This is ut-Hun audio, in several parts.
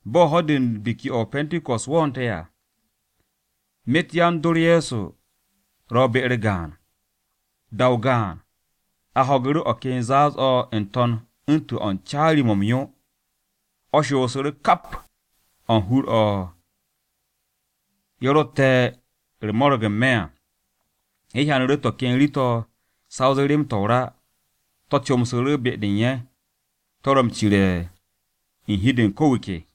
Bo̱ ho̱-de u̱n Biki-o̱ o-Pe̱nte̱ko̱s wo̱o̱nte̱ à, myet yan-dor Ye̱so ro be-u̱r gaan. Da-o gaan, a ho̱gu̱ru̱ o̱ ken zaaz-o̱ n-to̱n u̱ntu̱n o̱ u̱n caari-mo̱ m-yo, o̱ shoosu̱ru̱ kap o̱ u̱n ka hur-o̱ ye̱ rotte̱ u̱r-mo̱ro̱g n-me̱ à. Ye̱ hyanu̱ru̱ to̱ ken rii-to̱ sa o zee rem-to̱ o-ra. To̱ comsu̱ru̱ be-de u̱n ye̱, to̱ ro m-cire̱ u̱n hi-de u̱n ko̱ wu̱ ke.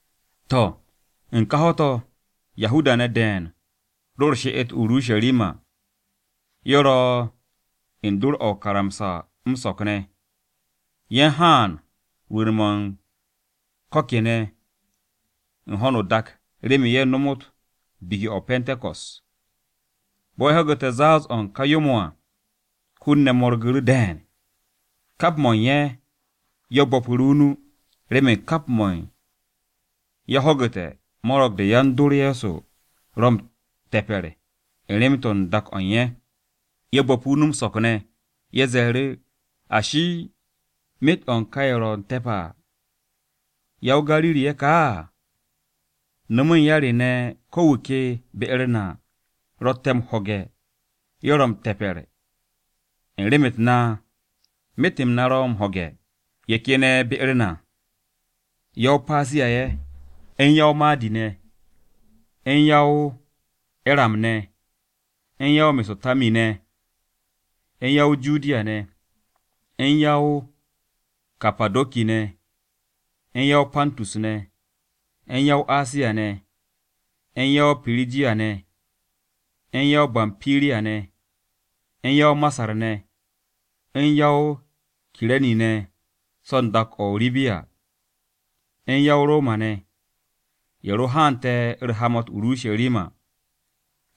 To̱, u̱n ka ho̱-to̱, Yahuda-ne̱ de̱e̱n ro u̱r-she'et o-Urusharima. Ye̱ ro̱ u̱n dor-o̱ o-karamsa m-so̱k ne̱ ne̱. Ye̱ u̱n haan rwu̱u̱n-mo̱ u̱n ko̱ kene̱ u̱n ho̱no o-dak remen ye̱ nomot Biki-o̱ o-Pe̱nte̱ko̱s. Bo̱ ye̱ ho̱gu̱te̱ zaaz-o̱ u̱n ka yo-mo̱ à, hun-ne̱ mo̱rgu̱ru̱ de̱e̱n. Kap mo̱ u̱n ye̱ ye̱ bo̱pu̱ru̱ o-nu, remen kap mo̱ u̱n ye̱ ho̱gu̱te̱ mo̱ro̱g-de yan-dor Ye̱so ro m-te̱pe̱r u̱n rem-de u̱n dak-o̱ u̱n ye̱. Ye̱ bo̱pu̱ o-nu m-so̱k ne̱, ye̱ ze̱e̱ru̱, “Ashi, ¿myet-o̱ u̱n ka ye̱ ro̱ te̱p à, ya-o-Gariri-ye̱ ka á? ¿No̱mu̱ u̱n ya re ne̱ ko wu̱ ke be-u̱r na ro̱tte̱ m-ho̱ge̱ ye̱ ro̱ m-te̱pe̱r u̱n rem-u̱t na? Myet-m na ro̱ m-ho̱ge̱. Ye̱ ken ye̱ be-u̱r na: Ya-o-Patiya-ye̱, u̱n Ya-o-Madi-ne̱, u̱n Ya-o-Eram-ne̱, u̱n Ya-o-Me̱so̱po̱tami-ne̱, u̱n Ya-o-Judiya-ne̱, u̱n Ya-o-Kapado̱ki-ne̱, u̱n Ya-o-Pantus-ne̱, u̱n Ya-o-Asiya-ne̱, u̱n Ya-o-Pirijiya-ne̱, u̱n Ya-o-Bampiriya-ne̱, u̱n Ya-o-Masar-ne̱, u̱n Ya-o-Kire̱ni-ne̱ so̱ u̱n dak-o̱ o-Ribiya, u̱n Ya-o-Roma-ne̱, ye̱ ro haante̱ u̱r-hamat o-Urusharima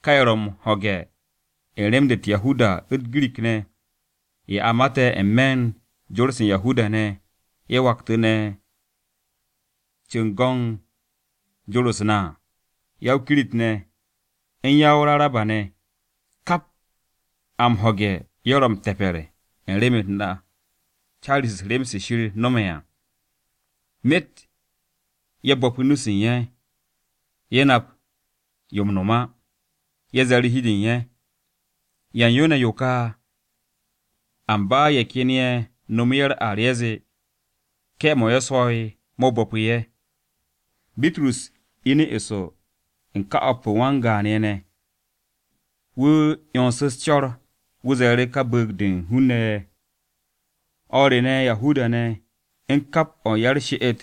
(Ka ye̱ ro̱ m-ho̱ge̱ u̱n rem-de u̱t-Ibra u̱n u̱t-Girik ne̱ à, ye̱ a mate̱ n-me̱ u̱n jor-se Yahuda-ne̱ u̱n ye̱ waktu̱ne̱ ye̱ cu̱w go̱n jor-u̱s na ne̱ à). U̱n ya-o-Kirit-ne̱, u̱n Ya-o-Raraba-ne̱. Kap a m-ho̱ge̱ ye̱ ro̱ m-te̱pe̱r u̱n rem-u̱t na caari-se u̱s-rem se̱ Shir no̱me̱ à!” Myet ye̱ bo̱pu̱ nu-se u̱n ye̱, ye̱ nap yo m-no̱m á, ye̱ ze̱e̱ru̱ hi-de u̱n ye̱, “¿Ya u̱n yo ne̱ yo ka?” Amba ye̱ ken ye̱ nomo ye̱ u̱r-ar ye̱ zee, “Ke̱-mo̱ ye̱ swo̱'e̱ mo̱ bo̱pu̱ ye̱.” Bitrus inu̱ eso u̱n ka o̱p u̱n wan-gaan ye̱ ne̱, wu̱ 'yonsu̱ u̱s-co̱r. Wu̱ ze̱e̱ru̱ ka bu̱u̱g-de u̱n hun-ne̱ de, “No̱ o̱r re ne̱, Yahuda-ne̱ u̱n kap o̱ u̱n ya-u̱r-she'et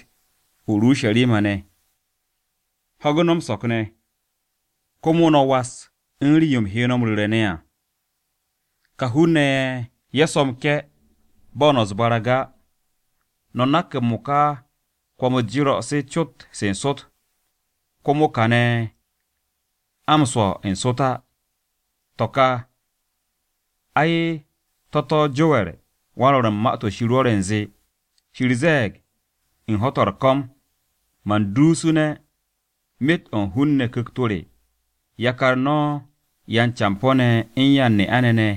o-Urusharima ne̱, ho̱gu̱ no̱ m-so̱k ne̱. Komo no̱ was u̱n rii-yo u̱m he no̱ m-ru̱re̱ ne̱ à. Ka hun-ne̱ ye̱ ye̱ swo̱ m-ke̱ bo̱ no̱ u̱s-barag á. No̱ nak m-mo̱ka kwo̱m-u̱s jero̱ se cot se n-sot. Komo kane̱ a m-swo̱ n-sot á. To̱ ka, ai, to̱ to̱ Jower wan-Rwo̱r u̱n Ma-to̱ Shir rwo̱re̱ u̱nze, “ ‘Shir ze̱e̱g: U̱n ho̱-to̱ u̱r-ko̱m, man duusu̱ne̱ myet o̱ u̱n hun-ne̱ Ku̱kt-o re. Yakar no̱ yan-campo̱-ne̱ u̱n yan-ne'a-ne̱ ne̱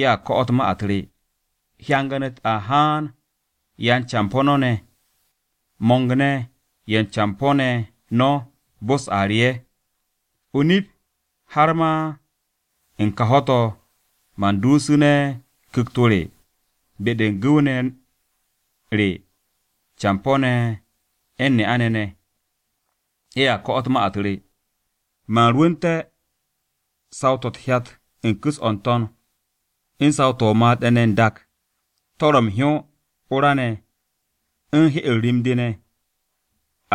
ye̱a ko̱'o̱t ma-u̱t re, hyangan-u̱t a haan yan-campo̱ no̱ ne̱, mo̱ng-ne̱ ye̱ u̱n campo̱-ne̱ no̱ bo-u̱s a re ye̱. O-nip, har ma u̱n ka ho̱-to̱ man duusu̱ne̱ Ku̱kt-o re be-de u̱n gu̱w-ne̱ re campo̱-ne̱ u̱n ne'a-ne̱ ne̱, ye̱a ko̱'o̱t ma-u̱t re. Man rwu̱nte̱ saw-to̱ u̱t-hyat u̱n ku̱s-o̱ n-to̱n, u̱n saw-to̱ o-made̱ ne̱ kane̱ n-dak, to̱ ro̱ m-hyó, o-ra ne̱, u̱n hye-u̱r rim-de ne̱.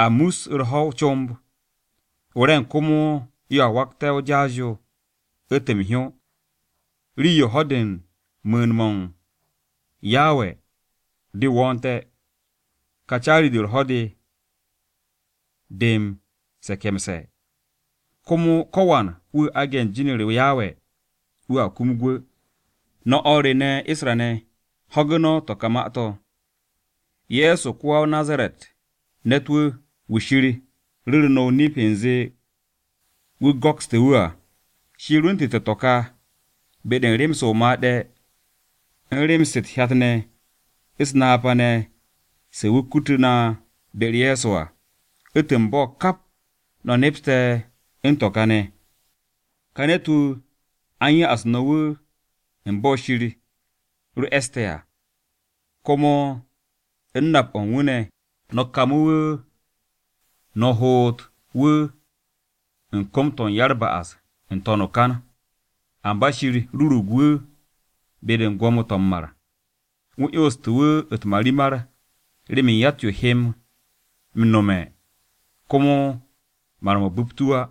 A mus u̱r-ho̱ o-comb, o-re̱ng komo yoa wakte̱ o-jaas yo u̱ntu̱n m-hyó, rii-yo ho̱-de u̱n mu̱u̱n-m Yawe de wo̱o̱nte̱, ka caari-de u̱r-ho̱ de, de m-se̱ke̱mse̱. Komo ko̱wan wu̱ aage̱ u̱n jin-u̱r Yawe, wu̱a kum gwu̱.’ “No̱ o̱r re ne̱ Isra-ne̱, ho̱gu̱ no̱ to̱ ka ma-to̱. Ye̱so ko-ya-o-Nazaret ne̱t-wu̱, wu̱ Shir ru̱ru̱ no̱ o-nip u̱nze wu̱ go̱kste̱ wu̱ à. Shir rwu̱ntu̱te̱ to̱ ka be-de u̱n rem-se o-made̱, u̱n rem-se u̱t-hyat ne̱, u̱s-napa ne̱ se wu̱ kutu̱ na be-u̱r Ye̱so à, u̱ntu̱n bo̱, kap no̱ nepste̱ u̱n to̱ ka ne̱. Ka ne̱t-wu̱, a u̱n ya'as no̱ wu̱ u̱n bo̱ Shir ro e̱ste̱ à. Komo u̱n nap-o̱ u̱n wu̱ ne̱, no̱ kamu̱ wu̱, no̱ hoot wu̱ u̱n kom-to̱ ya-u̱r-ba'as n-to̱n o-kan. Amba Shir rurug wu̱ be-de u̱n gwo̱mo-to̱ m-mar. Wu̱ 'yonstu̱ wu̱ u̱t-marimar remen yatt-yo he m-nome̱ komo mar-mo̱ bu̱pt wu̱ á.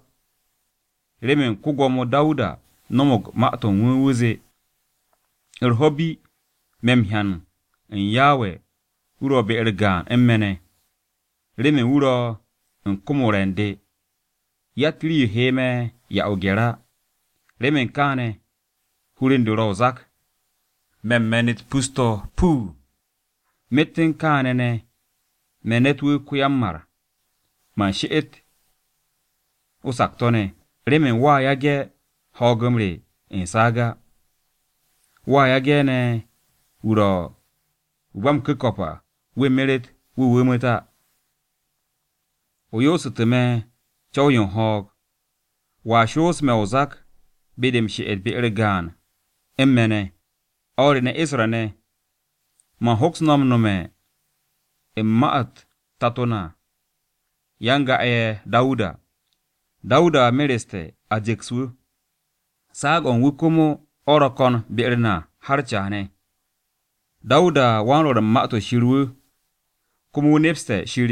Remen ko-Gwo̱mo Dawuda no̱mo̱g ma-to̱ u̱n wu̱, wu̱ zee, “ ‘U̱r-ho̱ bi me̱ m-hyan u̱n Yawe wu̱ ro̱ be-u̱r gaan u̱n me̱ ne̱. Remen wu̱ ro̱ u̱n kom-o̱ u̱n re̱ u̱n de, yatt rii-yo he me̱ 'ya o-gye̱r á. Remen kaane̱ hur u̱n de ro̱ o-zak, me̱ u̱n me̱n-u̱t pus-to̱ puu, myet u̱n kaane̱ ne̱ me̱ ne̱t-wu̱ ko-ya-m-mar, man she'et o-sakto̱ ne̱. Remen wo̱a yage̱ ho̱o̱g-m re u̱n saag á, wo̱a yage̱ ne̱ wu̱ ro̱ Wu̱ ba m-Ku̱ko̱p à, wu̱ meret wu̱ wu̱mu̱t á. O yoosu̱tu̱ me̱ co̱w-yo u̱n ho̱o̱g. Wo̱a shoos me̱ o-zak be-de m-she'et be-u̱r gaan u̱n me̱ ne̱.’ “O̱r re ne̱ Isra-ne̱, man hoks no̱ nome̱ u̱n ma-u̱t tato na ko-yan-ga'e̱ Dawuda. Dawuda mereste̱, a ju̱ks wu̱, saag-o̱ u̱n wu̱ komo o̱ ro̱ ko̱n be-u̱r na har caane̱. Dawudawan-Rwo̱r u̱n Ma-to̱ Shir wu̱, komo wu̱ nepste̱ Shir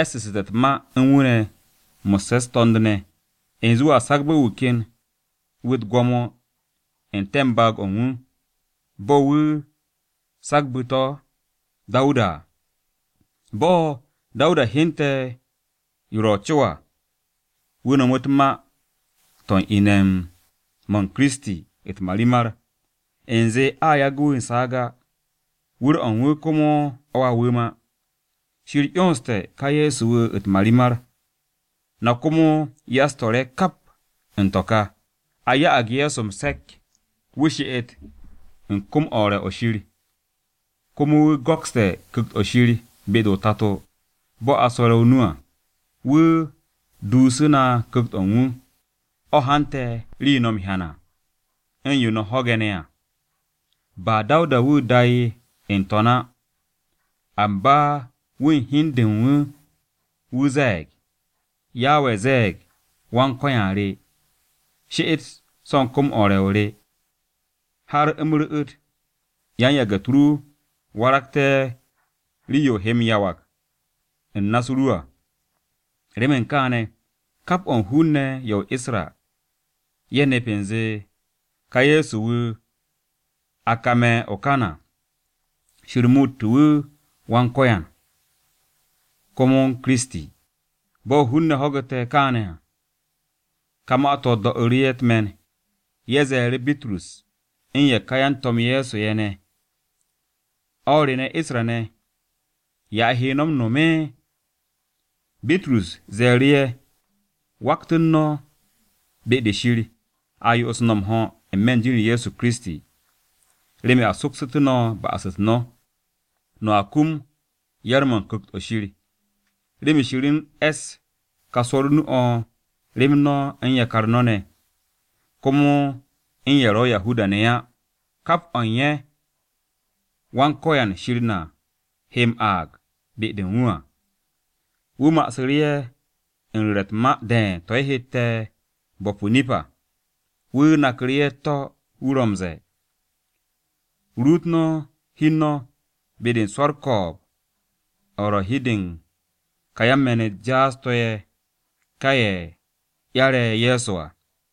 e̱ssu̱ssu̱te̱ u̱t-ma u̱n wu̱ ne̱ mo̱sse̱ u̱s-to̱nd ne̱, u̱nze wu̱a sagbe̱ wu̱ ken wu̱ u̱t-gwo̱mo n-te̱ baag-o u̱n wu̱, bo̱ wu̱ sagbu̱ to̱ Dawuda à. Bo̱ Dawuda hyente̱ yo ro̱ co à, wu̱ no̱mu̱ u̱t-ma to̱ u̱n ine̱-m Kiristi u̱t-marimar, u̱nze a yagu̱ wu̱ u̱n saag á, wu̱r-o̱ u̱n wu̱ komo o̱ a wu̱m á. Shir 'yonste̱ ka Ye̱so wu̱ u̱t-marimar, na komo ya-u̱s-to̱r-ye̱ kap u̱n to̱ ka. A ya'ag Ye̱so m-se̱k wu̱ she'et u̱n kom-o̱ u̱r-re̱ o̱ Shir. Komo wu̱ go̱kste̱ Ku̱kt-o̱ Shir be-de o-Tato, bo̱ a swo̱re̱ o-nu à. Wu̱ duusu na Ku̱kt-o̱ u̱n wu̱, o̱ hante̱ rii-yo no̱ m-hyan à, u̱n yo no̱ m-ho̱ge̱ ne̱ à. Ba Dawuda wu̱ da'e̱ n-To̱n á, amba wu̱ u̱n hi u̱n de u̱n wu̱, wu̱ ze̱e̱g, “ ‘Yawe ze̱e̱g Wan-Ko̱yan re, “She'et so̱ u̱n kom-o re o̱ u̱r-re̱, har u̱m ru̱'u̱t yan-yage̱-u̱t ru waragte̱ rii-yo o he m-yawag u̱n na-u̱s ru à.” ’ “Remen kaane̱, kap o̱ u̱n hun-ne̱ ye̱ o-Isra ye̱ nep u̱nze ka Ye̱so-wu̱ a kame̱ o-kan à, Shir muutu̱ wu̱ Wan-Ko̱yan, komo u̱n Kiristi.” Bo̱ hun-ne̱ ho̱gu̱te̱ kaane̱ à, ka ma-to̱ do̱'u̱ru̱ ye̱ u̱t-me̱n, ye̱ ze̱e̱ru̱ Bitrus u̱n ye̱ ka yan-To̱m-ye̱ Ye̱so ye̱ ne̱, “O̱r re ne̱ Isra-ne̱, ¿ya a he no̱ m-no̱m?” Bitrus ze̱e̱ru̱ ye̱, “Waktu̱n no̱ be-de Shir, a yo'os no̱ m-ho̱ n-me̱ u̱n jin-u̱r Ye̱so Kiristi remen a soksu̱tú̱ no̱ ba'as-u̱t no̱. No̱a kum yar-mo̱ u̱n Ku̱kt-o̱ Shir. Remen Shir u̱n e̱ss ka swo̱r o-nu o̱ rem no̱ u̱n yakar no̱ ne̱, komo u̱n ye̱ ro̱ Yahuda-ne̱ á, kap o̱ u̱n ye̱ Wan-Ko̱yan Shir na he m-aag be-de u̱n wu̱ à.” Wu̱ ma'asu̱ru̱ ye̱ u̱n ru̱re̱ u̱t-ma de̱e̱n to̱ ye̱ hette̱ bo̱p o-nip à, wu̱ naku̱ru̱ ye̱ u̱t-to̱ wu̱ ro̱ m-ze̱e̱, “Ruut no̱ hi u̱n no̱ be-de u̱n swo̱ u̱r-ko̱o̱b o̱ ro̱ u̱n hi-de u̱n kà yan-me̱n-u̱t jaas-to̱ ye̱, kà ye̱ 'yare̱ Ye̱so à.”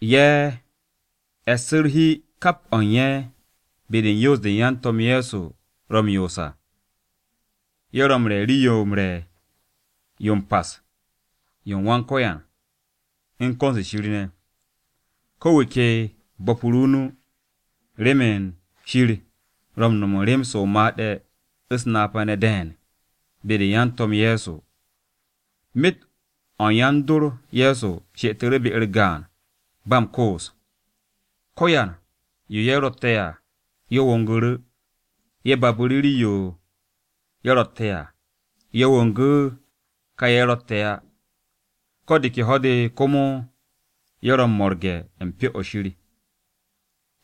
Ye̱ e̱ssu̱ u̱r-hi kap o̱ u̱n ye̱ be-de u̱n yoos-de yan-To̱m-ye̱ Ye̱so ro̱ m-yoos à. Ye̱ ro̱ m-re̱ Rii-yo m-Re̱ yo m-Pas yo u̱n Wan-Ko̱yan, u̱n ko̱n-se Shir ne̱. Ko̱ wu̱ ke bo̱pu̱ru̱ o-nu, remen Shir ro̱ u̱n no̱m u̱n rem-se o-made̱ u̱s-napa ne̱ de̱e̱n be-de u̱n yan-To̱m Ye̱so. Myet o̱ yan-dor Ye̱so she'etu̱ru̱ be-u̱r gaan ba m-koos, ko̱yan yo ye̱ ro̱tte̱ à ye̱ wongu̱ru̱. Ye̱ babu̱ru̱ rii-yo ye̱ ro̱tte̱ à, ye̱ wongu̱ ka ye̱ rotte̱ á. Ko̱ de ke ho̱-de komo ye̱ ro̱ mo̱rge̱ u̱n Pyo-o̱ Shir.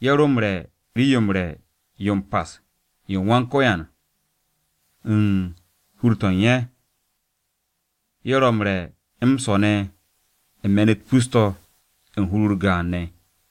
Ye̱ ro m-re̱ Rii-yo m-Re̱ yo m-Pas yo u̱n Wan-Ko̱yan u̱n hur-to̱ u̱n ye̱, ye̱ ro m-re̱ m-swo̱ ne̱ u̱n me̱n-u̱t pus-to̱, u̱n hur-u̱r gaan ne̱.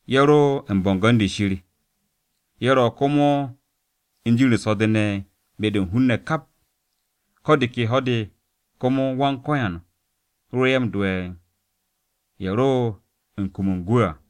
Ye̱ ro u̱n bo̱ngo̱n-de Shir. Ye̱ ro̱ komo u̱n jin-u̱r so̱-de ne̱ be-de u̱n hun-ne̱ kap. Ko̱ de ke ho̱-de komo Wan-Ko̱yan ro ye̱ m-do'e̱ u̱n ye̱ ro̱ u̱n kum u̱n gwu̱ à.